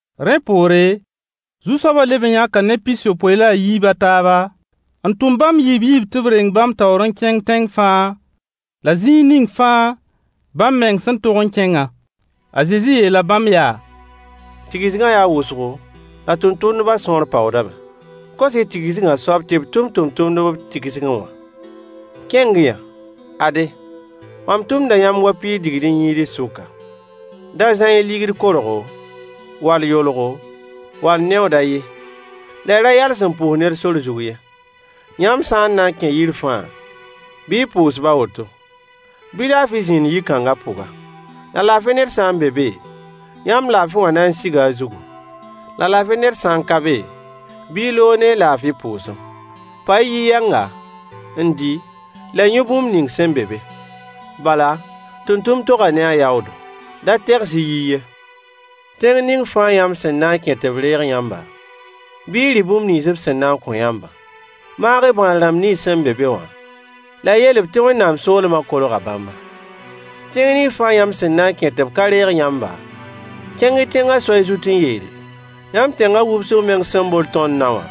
Rẽ poore, Zu-soabã leb n yãka neb pis-yopoe la a yiib a taaba, n tʋm bãmb yiib yiib tɩ b reng bãmb taoor n kẽng tẽng fãa la zĩig ning fãa bãmb meng sẽn tog n kẽngã. A Zezi yeela bãmb yaa: Tigsgã yaa wʋsgo la tʋmtʋmdbã sõor paoodame. Kos-y tigsgã soab tɩ b tʋm tʋmtʋmdb b tigsgẽ wã. Kẽng-y-yã! Ade, mam tʋmda yãmb wa piis digd-n-yĩids sʋka. Da zã-y ligd korgo, wall yolgo, wall neooda ye, la y ra yals n pʋʋs ned sor zug ye. Yãmb sã n na n kẽ yir fãa, bɩ y pʋʋs-b a woto: Bɩ laafɩ zĩnd yi-kãnga pʋga. La laafɩ ned sã n be be, yãmb laafɩ wã na n siga a zugu. La laafɩ ned sã n ka be, bɩ y loog ne y laafɩ pʋʋsem. Pa-y yi-yɛnga, n dɩ la y yũ bũmb ning sẽn be be. Bala, tʋmtʋmd toga ne a yaoodo. Da-y tegs-y yiy ye. Tẽng ning fãa yãmb sẽn na n kẽ tɩ b reeg yãmba, bɩ y rɩ bũmb nins b sẽn na n kõ yãmbã. Maag-y bãad-rãmb nins sẽn be be wã, la y yeel-b tɩ Wẽnnaam soolmã kolga bãmba. Tẽng ning fãa yãmb sẽn na n kẽ tɩ b ka reeg yãmba, kẽng-y tẽngã soay zut n yeele: Yãmb tẽngã wubsg meng sẽn bol tõnd nao wã,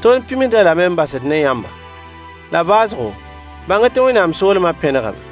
tõnd pĩmsd-a lame n basd ne yãmba. La baoosgo, bãng-y tɩ Wẽnnaam soolmã pẽnegame.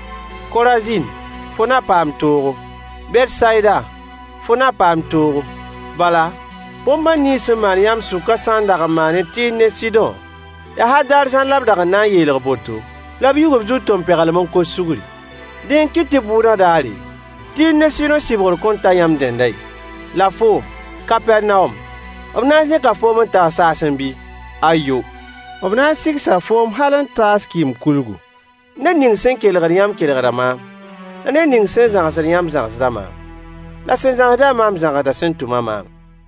Korazin, fo na paam toogo! Betsayida, fo na paam toogo! Bala, bõn-bãn nins sẽn maan yãmb sʋkã sã n dag n maanẽ Tɩɩr ne Sɩdõ, yaa hal daar zãr la b da na n yeelg boto, la b yug b zug tompeglem n kos sugri. Dẽ n kɩt tɩ bʋʋdã daare, Tɩɩr ne Sɩdõ sɩbgr kõn ta yãmb dẽndã ye. La foom, Kapɛrnawom, b na n zẽka foom n taas saasẽ bɩ? Ayo! B na n sigsa foom hal n taas kɩɩm-kulgu. Ned ning sẽn kelgd yãmb kelgda maam. La ned ning sẽn zãgsd yãmb zãgsda maam. La sẽn zãgsd-a maam zãgsda sẽn tʋm-a maamã.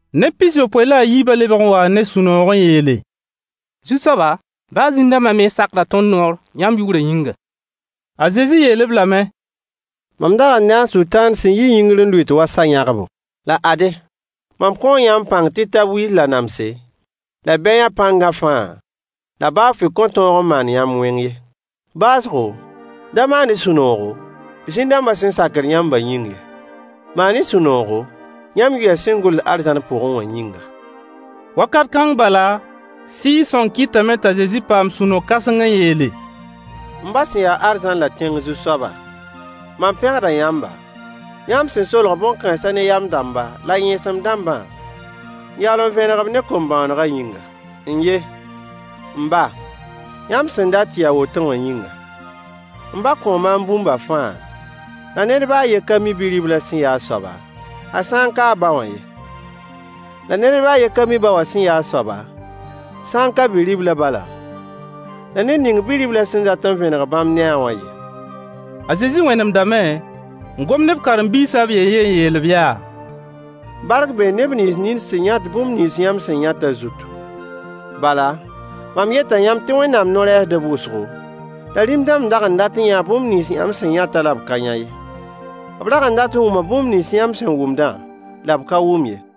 Neb pis-yopoe la a yiibã lebg n waa ne sũ-noog n yeele: Zu-soaba, baa zĩn-dãmba mens sakda tõnd noor yãmb yʋʋrã yĩnga. A Zezi yeel-b lame: Mam dag n nee a Sʋtãan sẽn yi yĩngr n lʋɩt wa sa-yãgbo. La ade, mam kõo yãmb pãng tɩ y tab wiis la namse, la bɛyã pãngã fãa, la baa fʋɩ kõn tõog n maan yãmb wẽng ye. Baoosgo, da maan-y sũ-noogo, zĩn-dãmbã sẽn sakd yãmbã yĩng ye. Maan-y sũ-noogo, yãmb yʋɩyã sẽn gʋls arzãn pʋgẽ wã yĩnga. Wakat kãng bala, Sɩɩg-sõng kɩtame t'a Zezi paam sũ-no-kãseng n yeele: M ba sẽn ya arzãn la tẽng Zu-soaba, mam pẽgda yãmba, yãmb sẽn solg bõn-kãens ne yam-dãmba la yẽesem-dãmbã, n yaool n vẽneg-b ne kom-bõonegã yĩnga. N ye, m ba, yãmb sẽn dat tɩ yɩ a woto wã yĩnga. M ba kõo maam bũmba fãa, la ned baa a yen ka mi Bi-riblã sẽn yaa a soaba, a sã n ka a ba wã ye. La ned baa a yen ka mi ba wã sẽn yaa a soaba, sã n ka Bi-riblã bala, la ned ning Bi-riblã sẽn dat n vẽneg bãmb ne-a wã ye. A Zezi wẽnemdame n gom ne b karen-biisã b yen-yen n yeel-b yaa: Bark bee neb nins nin sẽn yãt bũmb nins yãmb sẽn yãtã zutu. Bala, mam yeta yãmb tɩ Wẽnnaam no-rɛɛsdb wʋsgo, la rĩm-dãmb dag n dat n yãa bũmb nins yãmb sẽn yãtã la b ka yã ye. B dag n dat n wʋma bũmb nins yãmb sẽn wʋmdã la b ka wʋm ye.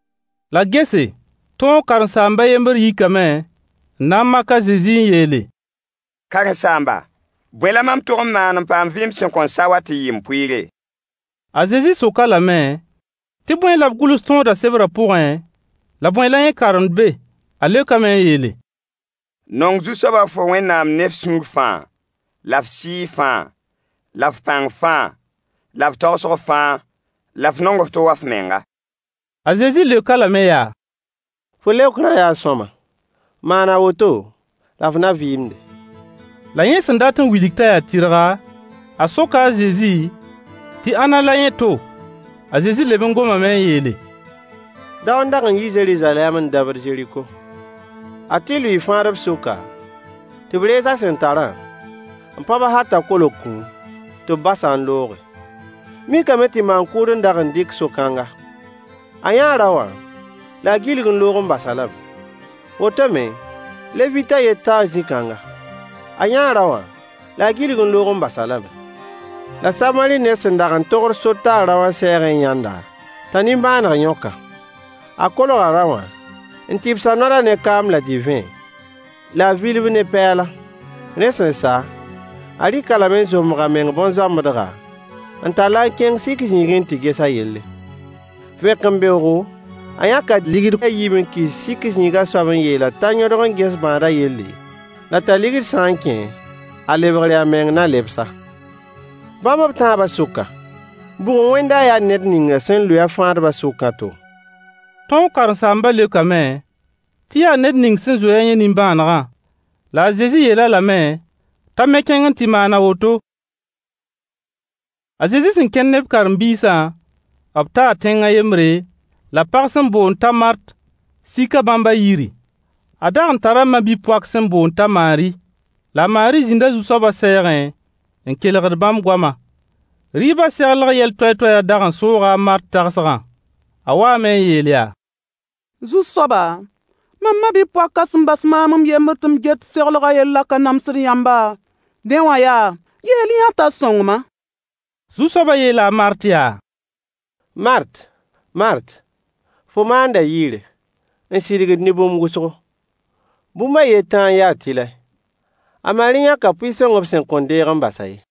La gese, tõog karen-saamb a yembr yikame n na n mak a Zezi n yeele: Karen-saamba, bõe la mam tog n maan n paam vɩɩm sẽn kõn sa wã tɩ yɩ m pʋɩɩre? A Zezi sok-a lame tɩ bõe la b gʋls tõodã sebrã pʋgẽ, la bõe la yẽ karemd be? A leokame n yeele: Nong Zu-soaba fo Wẽnnaam ne f sũur fãa, la f sɩɩg fãa, la f pãng fãa, la f tagsg fãa, la f nong f to wa f menga. A Zezi leok-a lame yaa: Fo leokrã yaa sõama. Maan a woto, la f na vɩɩmde. La yẽ sẽn dat n wilg t'a yaa tɩrga, a soka a Zezi tɩ ãnna la yẽ to? A Zezi leb n gomame n yeele: Dao n dag n yi Zeruzalɛm n dabd Zeriko. A tɩ lʋɩɩ fãadb sʋka, tɩ b rees a sẽn tarã, n pãb-a hal t'a kolg kũum, tɩ b bas-a n looge. Mikame tɩ maan-kʋʋd n dag n dɩk so-kãnga. A yãa rao wã, la a gilg n loog n bas-a lame. Woto me, Levit a yen taa zĩ-kãnga. A yãa rao wã, la a gilg n loog n bas-a lame. La Samari ned sẽn dag n togd sor taa rao wã sɛɛgẽ n yãnd-a, t'a nimbãaneg yõk-a. A kolga rao wã, n tɩbs a noadã ne kaam la divẽ, la a vil-b ne pɛɛla. Rẽ sẽn sa, a rɩk-a lame n zombg a meng bõn-zoambedga, n tall-a n kẽng sik zĩigẽ n tɩ ges a yelle. Vẽkembeoogo, a yãka deniye a yiib n kɩs sik zĩigã soab n yeel-a t'a yõdg n ges bãadã yelle, la t'a ligd sã n kẽ, a lebgre a meng na lebs-a. Bãmb b tãabã sʋka, bʋg n wẽnda a yaa ned ning sẽn lʋɩ-a fãadbã sʋkã to? Tõog karen-saambã leokame tɩ yaa ned ning sẽn zoe-a yẽ nimbãanegã. La a Zezi yeel-a lame t'a me kẽng n tɩ maan a woto. A Zezi sẽn kẽnd ne b karen-biisã, b taa tẽng a yembre, la pag sẽn boond t'a Mart sika bãmb a yiri. A dag n tara ma-bi-poak sẽn boond t'a Maari. La a Maari zĩnda Zu-soabã sɛɛgẽ n kelgd bãmb goama. Rɩɩbã seglg yɛl toay-toayã dag n sooga a Mart tagsgã. A waame n yeel yaa: Zu-soaba, mam ma-bi-poakã sẽn bas maam m yembr tɩ m get seglgã yellã ka namsd yãmba? Dẽ wã yaa, yeel-y-yã-a t'a sõng-ma. Zu-soabã yeela a Mart yaa: Mart! Mart! Fo maanda yɩɩre, n sidgd ne bũmb wʋsgo. Bũmb a yen tãa n ya tɩlɛ. A Maari yãka pʋɩ-sõng b sẽn kõn deeg n bas-a ye.